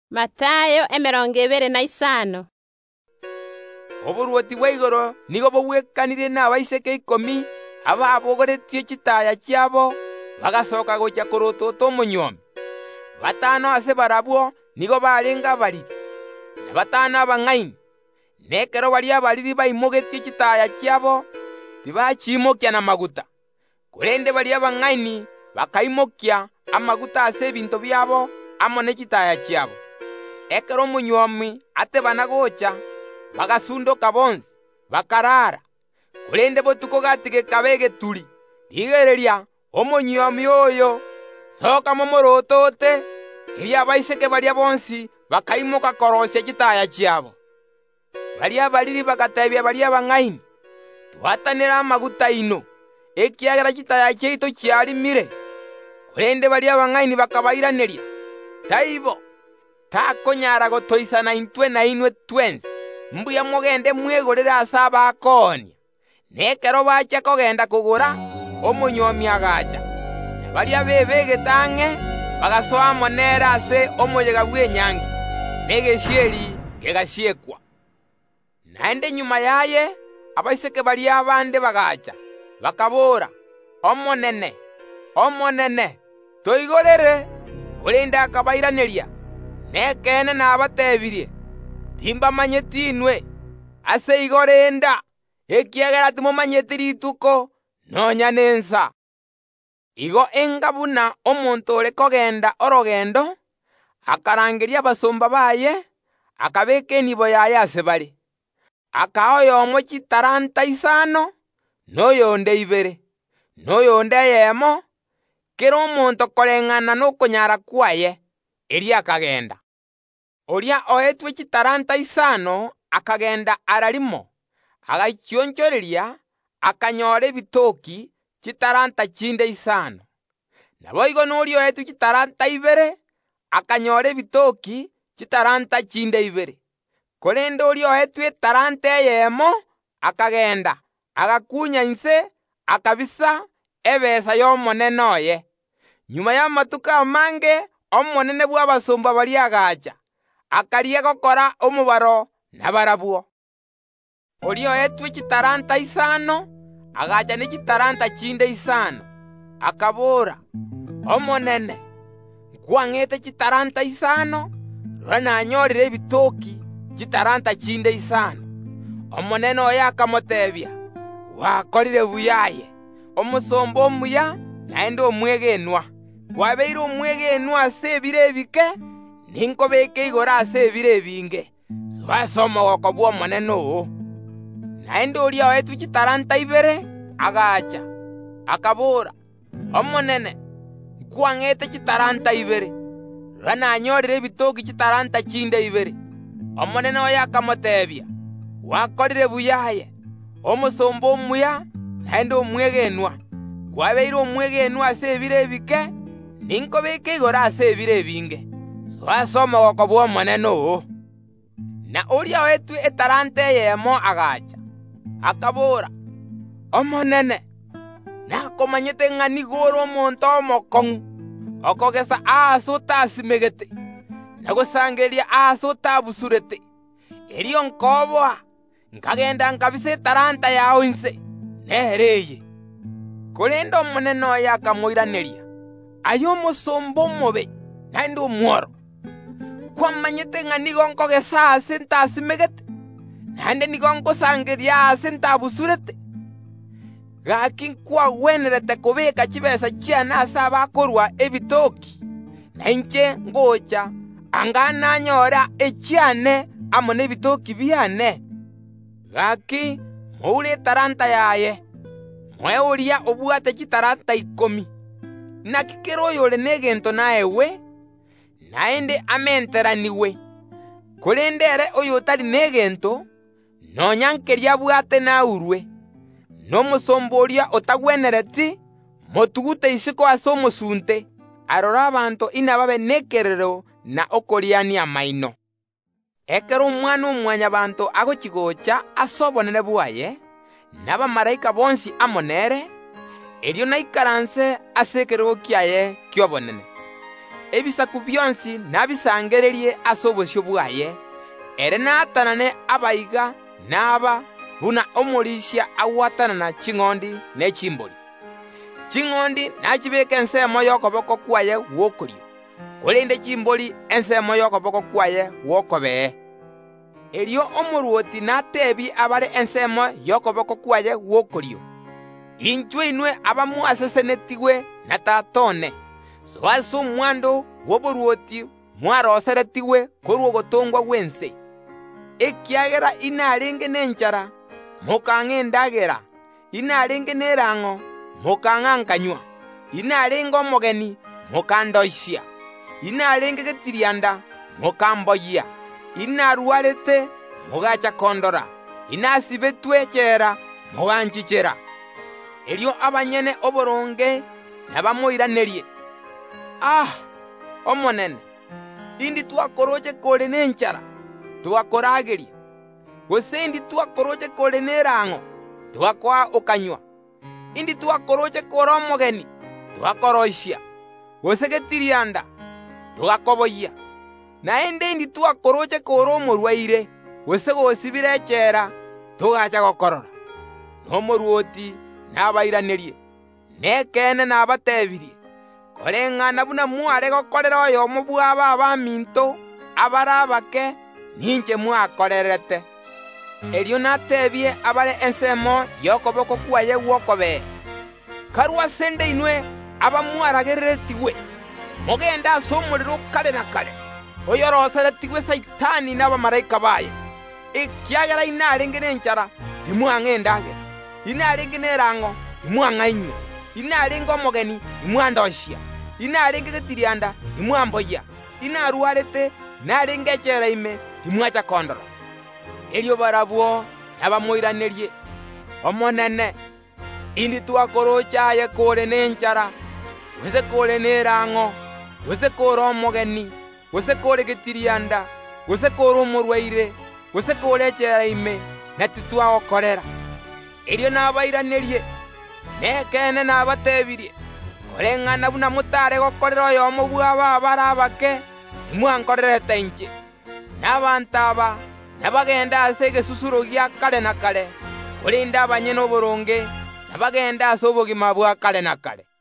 Ase chingaki echio, oborwoti bwa igoro nigo boragwekanigwe n’abaiseke ikomi ababogoretie chitaaya chiabo, bagasoka gochia korotota omonywomi. Batano ase barabwo nigo barenge abariri, na batano abang’aini. Na ekero baria abariri baimogetie chitaaya chiabo, korende tibaimokia y’ogochi komenta; korende baria abang’aini bakaimokia amaguta ase ebinto biabo amo ne chitaaya chiabo. Ekero omonywomi atebana gocha, bagasundoka bonsi, bakarara. Korende botuko gati gekaba egeturi: Rigereria, omonywomi oyo! Soka momorotote! Erio abaiseke baria bonsi bakaimoka koroisia chitaaya chiabo. Baria abariri bagateebia baria abang’aini: Twatanere amaguta aino, ekiagera chitaaya chiaito chiarimire. Korende baria abang’aini bakabairaneria: Taibo. Takonyara gotoisana intwe amo nainwe, mbuya mogende mwegorere ase abaonia. Na ekero bachia kogenda kogora, omonywomi agacha, na baria bebegete ang’e bagasoa amo nere ase omoyega bw’enyangi; na egesieri kegasiekwa. Naende magega yaye abaiseke baria bande bagaacha, bakaboora: Omonene, toigorere! Korende akabairaneria: Nekeene nabateebirie: Timbamanyeti inwe. Yeso agakoora ogoteeba “Ase igo renda, ekiagera timomanyeti rituko, nonya nensa. “Ase chingaki echio nigo erache koba buna omonto ore kogenda orogendo, akarangeria abasomba baye, akabeeka enibo yaye ase bare. Akaa oyomo chitalanta isano, na oyonde ibere, na oyonde eyemo, kera omonto koreng’ana nokonyara kwaye. Erio akagenda. Oria oetwe chitalanta isano akagenda erio kegima, agachionchoreria, akanyora ebitoki, chitalanta chinde isano. Naboigo noria oetwe chitalanta ibere akanyora ebitoki, chitalanta chinde ibere. Korende oria oetwe etalanta eyeemo akagenda, agakuunya inse, akabisa ebesa y’omonene oye. Magega y’amatuko amange omonene bw’abasomba baria agacha, akarigia gokora omobaro nabarabwo. Oria oetwe chitalanta isano agacha ne chitalanta chinde isano, akabora: Omonene, nkwang’ete chitalanta isano, rora nanyorire ebitoki, chitalanta chinde isano. Omonene oye akamoteebia: Gwakorire buya aye, omosomba omuya naende omwegenwa; kwabeire omwegenwa ase ebire ebike, ninkobeke igoro ase ebire ebinge. Soa ase omogooko bw’omonene oo. Naende oria oetwe chitalanta ibere agacha, akabora: Omonene, nkwang’ete chitalanta ibere, rora, nanyorire ebitoki, chitalanta chinde ibere. Omonene akamoteebia: Gwakorire buya aye, omosomba omuya naende omwegenwa; kwabeire omwegenwa ase ebire ebike, ninkobeke igoro ase ebire ebinge. Soa ase omogooko bw’omonene oo. Na oria oetwe etalanta eyemo agacha, akabora: Omonene, nakomanyete ng’a nigo ore omonto omokong’u, okogesa aase otasimegete, na gosangereria aase otabusurete; erio nkoboa, nkagenda nkabisa etalanta yao inse. Nero eye. Korende omonene oye akamoiraneria: Aye omosomba omobe naende omworo! Nkwamanyete ng’a nigo nkogesa aase ntasimegete, naende nigo ngosangereria aase ntabusureti? Gaki nkwagwenerete kobeeka chitaabu chiane ase abakorua efaida, na inche ngocha, anga nanyora echiane amo nefaida y’ane. Bono moure etalanta yaye, moe oria obwate chitalanta ikomi. Inaki kera oyore negento naegwe, naende amenteranigwe; korende ere oyotari negento, nonya nkeria abwate naurwe. Na omosomba oria otagwenereti, motugute isiko ase omosunte, aroro narere na koriania amaino. “Ekero Omwana-o-Mwanyabaanto agochi‐goocha ase obonene bwaye, na abamalaika bonsi amo nere, erio naikaranse ase ekerogo kiaye ki’obonene. Ebisaku bionsi nabisangererie ase obosio bwaye; ere naatanane abanto buna omorisia agwatanana ching’ondi ne chimbori. Ching’ondi nachibeeke ensemo y’okoboko kwaye gw’okorio, korende chimbori ensemo y’okoboko kwaye gw’okobee. Erio Omorwoti nateebie abare ensemo y’okoboko kwaye gw’okorio: Inchuo inwe abamwasesenetigwe na Tata one, soa ase omwando bw’oborwoti mwaroiseretigwe korwa ogotongwa gw’ense, ekiagera inarenge nenchara, mokang’a endagera; inarenge nerang’o, mokang’a nkanywa; inarenge omogeni, mokandoisia; inarenge getirianda, mokamboyia; inarwarete, mogaacha kondora; inasibetwe echela, moganchichera. Erio abanyene oboronge nabamoiranerie: A! Omonene, indi twakorooche kore nenchara, togakorageria? Gose indi twakorooche kore nerang’o, togakoa okanywa? Indi twakorooche kore omogeni, togakoroisia, gose getirianda, togakoboyia? Naende indi twakorooche kore omorwaire, gose gosibire echela, togaacha gokorora? Na Omorwoti nabairanerie: Nekeene nabateebirie: Koreng’ana buna mware gokorera oyomo bw’aba abaminto abare abake, ninche mwakorerete. Erio nateebie abare ensemo y’okoboko kwaye gw’okobee: Karue ase ’nde inwe abamwaragereretigwe, mogende ase omorero o kare na kare, oyoroiseretigwe Saitani na abamalaika baye, ekiagera inarenge nenchara, timwang’a endagera; inarenge nerang’o, timwang’a inywe. Inarenge omogeni, timwandoisia; inarenge getirianda, timwamboyia; inarwarete, naende inarenge echela ime, timwacha kondora. Erio barabwo nabamoiranerie: Omonene, indi twakorooche aye kore nenchara, gose kore nerang’o, gose kore omogeni, gose kore getirianda, gose kore omorwaire, gose kore echela ime, na titwagokorera? Erio omorwoti nabairanerie: Nekeene nabateebirie: Koreng’ana buna motare gokorera oyomo bw’aba abare abake, timwankorerete inche. Na abanto aba nabagende ase egesusuro gia kare na kare, korende abanyene oboronge inabagende ase obogima bwa kare na kare.”